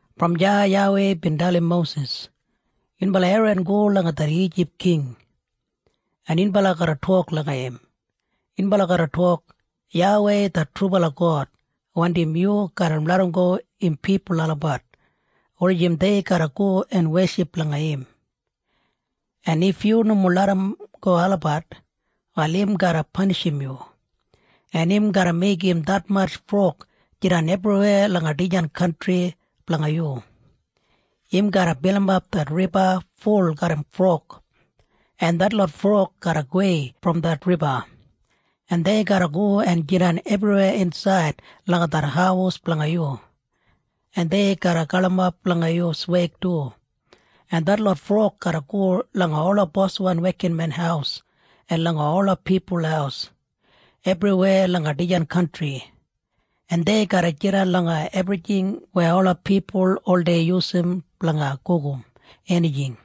Brom deya YAWEI bin dalim Mosis, “Yunbala Eran go langa det Ijip king, en yunbala garra tok langa im. Yunbala garra tok, ‘YAWEI det trubala God wandim yu garra larramgo im pipul olabat wulijim dei garra go en weship langa im. En if yu nomo larramgo olabat, wal im garra panishim yu, en im garra meigim detmatj frog jidan ebriweya langa dijan kantri blanga yu. Im garra bilimap det riba ful garram frog, en detlot frog garra gowei brom det riba, en dei garra go en jidan ebriweya insaid langa det haus blanga yu, en dei garra galimap langa yu sweig du. En detlot frog garra go langa ola boswan wekinmen haus en langa ola pipul haus ebriweya langa dijan kantri, en dei garra jidan langa ebrijing weya ola pipul oldei yusum blanga gugum enijing.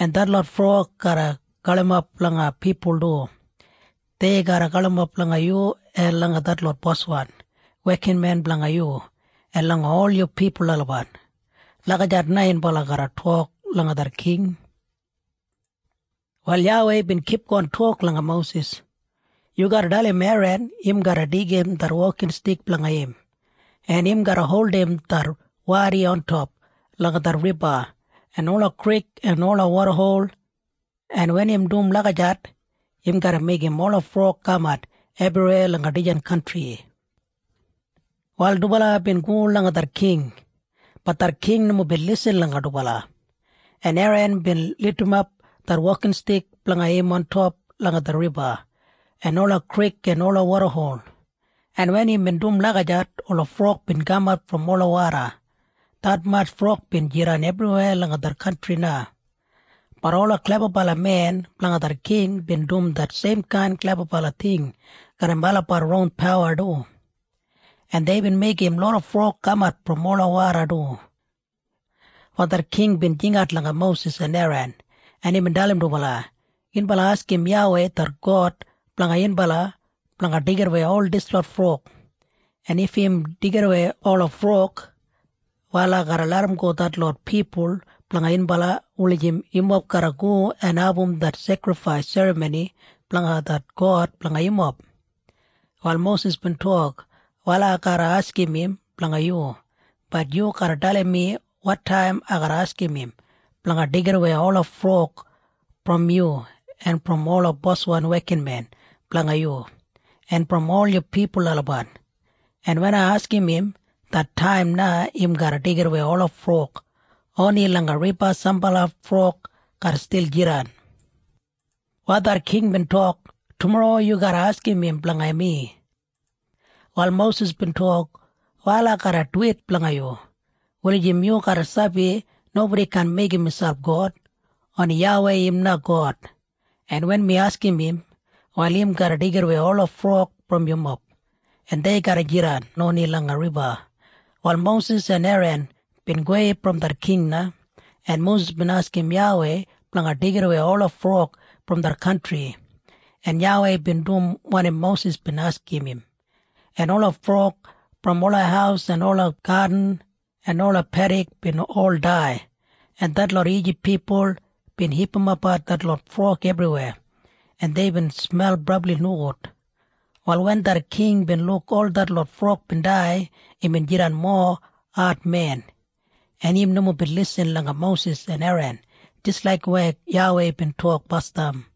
En detlot frog garra galimap langa pipul du. Dei garra galimap langa yu en langa detlot boswan wekinmen blanga yu en langa ol yu pipul olabat.’ Lagijat na yunbala garra tok langa det king.” Wal YAWEI bin kipgon tok langa Mosis, “Yu garra dalim Eran im garra deigim det wokinstik blanga im, en im garra holdim det wadi ontop langa det riba en ola krik en ola wodahol. En wen im dum lagijat, im garra meigim ola frog kamat ebriweya langa dijan kantri.” Wal dubala bin go langa det king. Bat det king nomo bin lisin langa dubala, en Eran bin lidimap det wokinstik blanga im ontop langa det riba en ola krik en ola wodahol, en wen imbin dum lagijat, ola frog bin kamat brom ola woda. Detmatj frog bin jidan ebriweya langa det kantri na. Bat ola klebabalamen blanga det king bin dum det seimkain klebabala ting garram olabat ron pawa du, en deibin meigim loda frog kamat brom ola woda du. Wal det king bin jingat langa Mosis en Eran, en imbin dalim dubala, “Yunbala askim YAWEI det God blanga yunbala blanga deigidawei ol dislot frog. En if im deigidawei ola frog, wal ai garra larramgo detlot pipul blanga yunbala wulijim yumob garra go en abum det sekrifais serramoni blanga det God blanga yumob.” Wal Mosis bin tok, “Wal ai garra askim im blanga yu. Bat yu garra dalim mi wotaim ai garra askim im blanga deigidawei ola frog brom yu en brom ola boswan wekinmen blanga yu en brom ol yu pipul olabat. En wen ai askim im, det taim na im garra deigidawei ola frog. Oni langa riba sambala frog garra stil jidan.” Wal det king bin tok, “Tumorro yu garra askim im blanga mi.” Wal Mosis bin tok, “Wal ai garra duwit blanga yu wulijim yu garra sabi nobodi kaan meigim miselp God. Oni YAWEI im na God. En wen mi askim im, wal im garra deigidawei ola frog brom yumob, en dei garra jidan oni langa riba.” Wal Mosis en Eran bin gowei brom det king na, en Mosis bin askim YAWEI blanga deigidawei ola frog brom det kantri, en YAWEI bin dum wanim Mosis bin askim im, en ola frog brom ola haus en ola gadin en ola pedik bin ol dai, en detlot Ijip pipul bin hipimapbat detlot frog ebriweya, en deibin smel brabli nogud. Wal wen det king bin luk ol detlot frog bin dai, imbin jidan mowa admen, en im nomo bin lisin langa Mosis en Eran jis laik weya YAWEI bin tok basdam.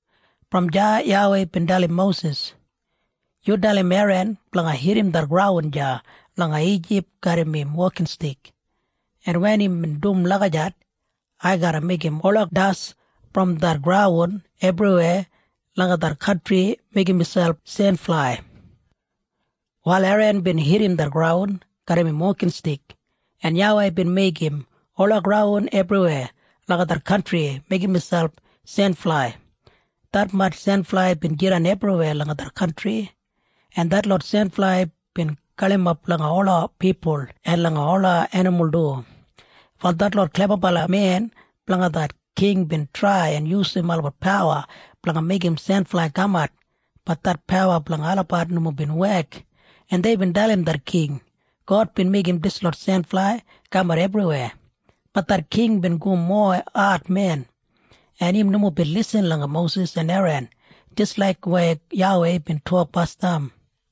Brom deya YAWEI bin dalim Mosis, “Yu dalim Eran blanga hitim det graun deya langa Ijip garram im wokinstik. En wen im dum lagijat, ai garra meigim ola das brom det graun ebriweya langa det kantri meigim miselp senflai.” Wal Eran bin hitim det graun garram im wokinstik, en YAWEI bin meigim ola graun ebriweya langa det kantri meigim miselp senflai. Detmatj senflai bin jidan ebriweya langa det kantri, en detlot senflai bin galimap langa ola pipul en langa ola enimul du. Wal detlot klebabalamen blanga det king bin trai en yusum olabat pawa blanga meigim senflai kamat. Bat det pawa blanga olabat nomo bin wek, en deibin dalim det king, “God bin meigim dislot senflai kamat ebriweya.” Bat det king bin go mowa admen, en im nomo bin lisin langa Mosis en Eran jis laik weya YAWEI bin tok basdam.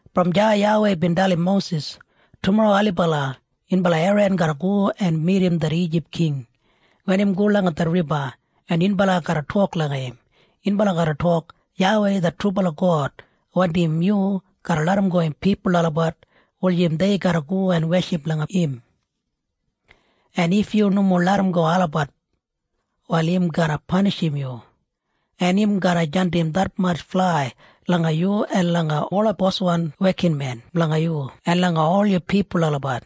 Brom deya YAWEI bin dalim Mosis, “Tumorro ailibala yunbala Eran garra go en midim det Ijip king wen im go langa det riba, en yunbala garra tok langa im. Yunbala garra tok, ‘YAWEI det trubala God wandim yu garra larramgo im pipul olabat wulijim dei garra go en weship langa im. En if yu nomo larramgo olabat, wal im garra panishim yu, en im garra jandim detmatj flai langa yu en langa ola boswan wekinmen blanga yu en langa ol yu pipul olabat.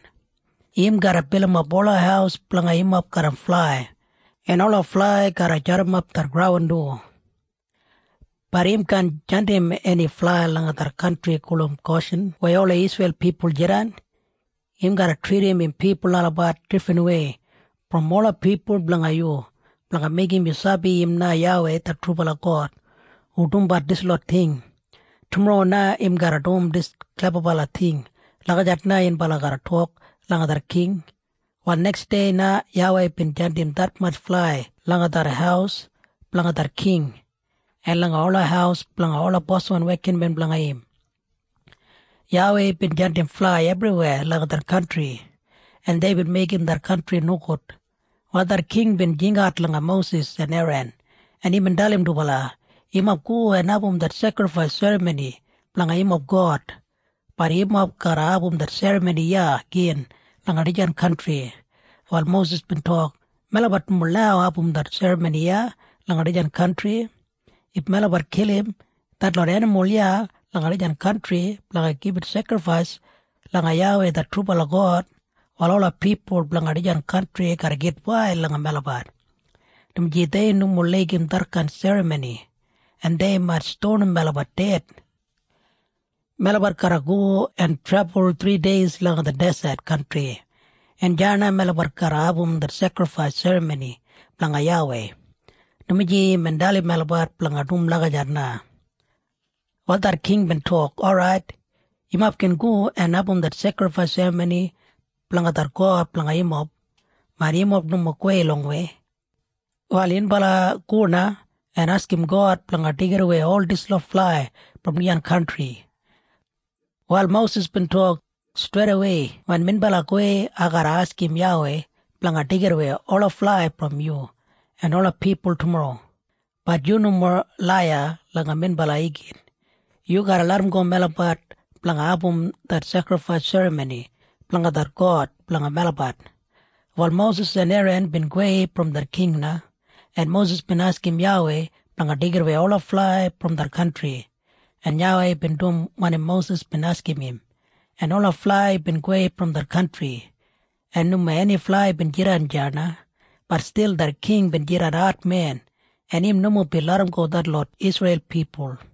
Im garra bilimap ola haus blanga yumob garram flai, en ola flai garra jadimap det graun du. Bat im kaan jandim eni flai langa det kantri gulum Goshin weya ola Isreil pipul jidan. Im garra tridim im pipul olabat difrinwei brom ola pipul blanga yu blanga meigim yu sabi im na YAWEI det trubala God hu dumbat dislot ting. Tumorro na im garra dum dis klebabala ting.’ Lagijat na yunbala garra tok langa det king.” Wal neksdei na YAWEI bin jandim detmatj flai langa det haus blanga det king en langa ola haus blanga ola boswan wekinmen blanga im. YAWEI bin jandim flai ebriweya langa det kantri, en deibin meigim det kantri nogud. Wal det king bin jingat langa Mosis en Eran, en imbin dalim dubala, “Yumob go en abum det sekrifais serramoni blanga yumob God. Bat yumob garra abum det serramoni iya gin langa dijan kantri.” Wal Mosis bin tok, “Melabat nomo lau abum det serramoni iya langa dijan kantri. If melabat kilim detlot enimul iya langa dijan kantri blanga gibit sekrifais langa YAWEI det trubala God, wal ola pipul blanga dijan kantri garra gitwail langa melabat, dumaji dei nomo laigim detkain serramoni, en dei mait stonim melabat ded. Melabat garra go en trebul thrideis langa det deset kantri, en deya na melabat garra abum det sekrifais serramoni blanga YAWEI, dumaji imbin dalim melabat blanga dum lagijat na.” Wal det king bin tok, “Orait. Yumob gin go en abum det sekrifais serramoni blanga det God blanga yumob. Bat yumob nomo gowei longwei. Wal yunbala go na en askim God blanga deigidawei ol dislot flai brom dijan kantri.” Wal Mosis bin tok, “Streidawei wen minbala gowei, ai garra askim YAWEI blanga deigidawei ola flai brom yu en ola pipul tumorro. Bat yu nomo laiya langa minbala igin. Yu garra larramgo melabat blanga abum det sekrifais serramoni blanga det God blanga melabat.” Wal Mosis en Eran bin gowei brom det king na, en Mosis bin askim YAWEI blanga deigidawei ola flai brom det kantri, en YAWEI bin dum wanim Mosis bin askim im, en ola flai bin gowei brom det kantri, en nomo eni flai bin jidan deya na. Bat stil det king bin jidan admen, en im nomo bin larramgo detlot Isreil pipul.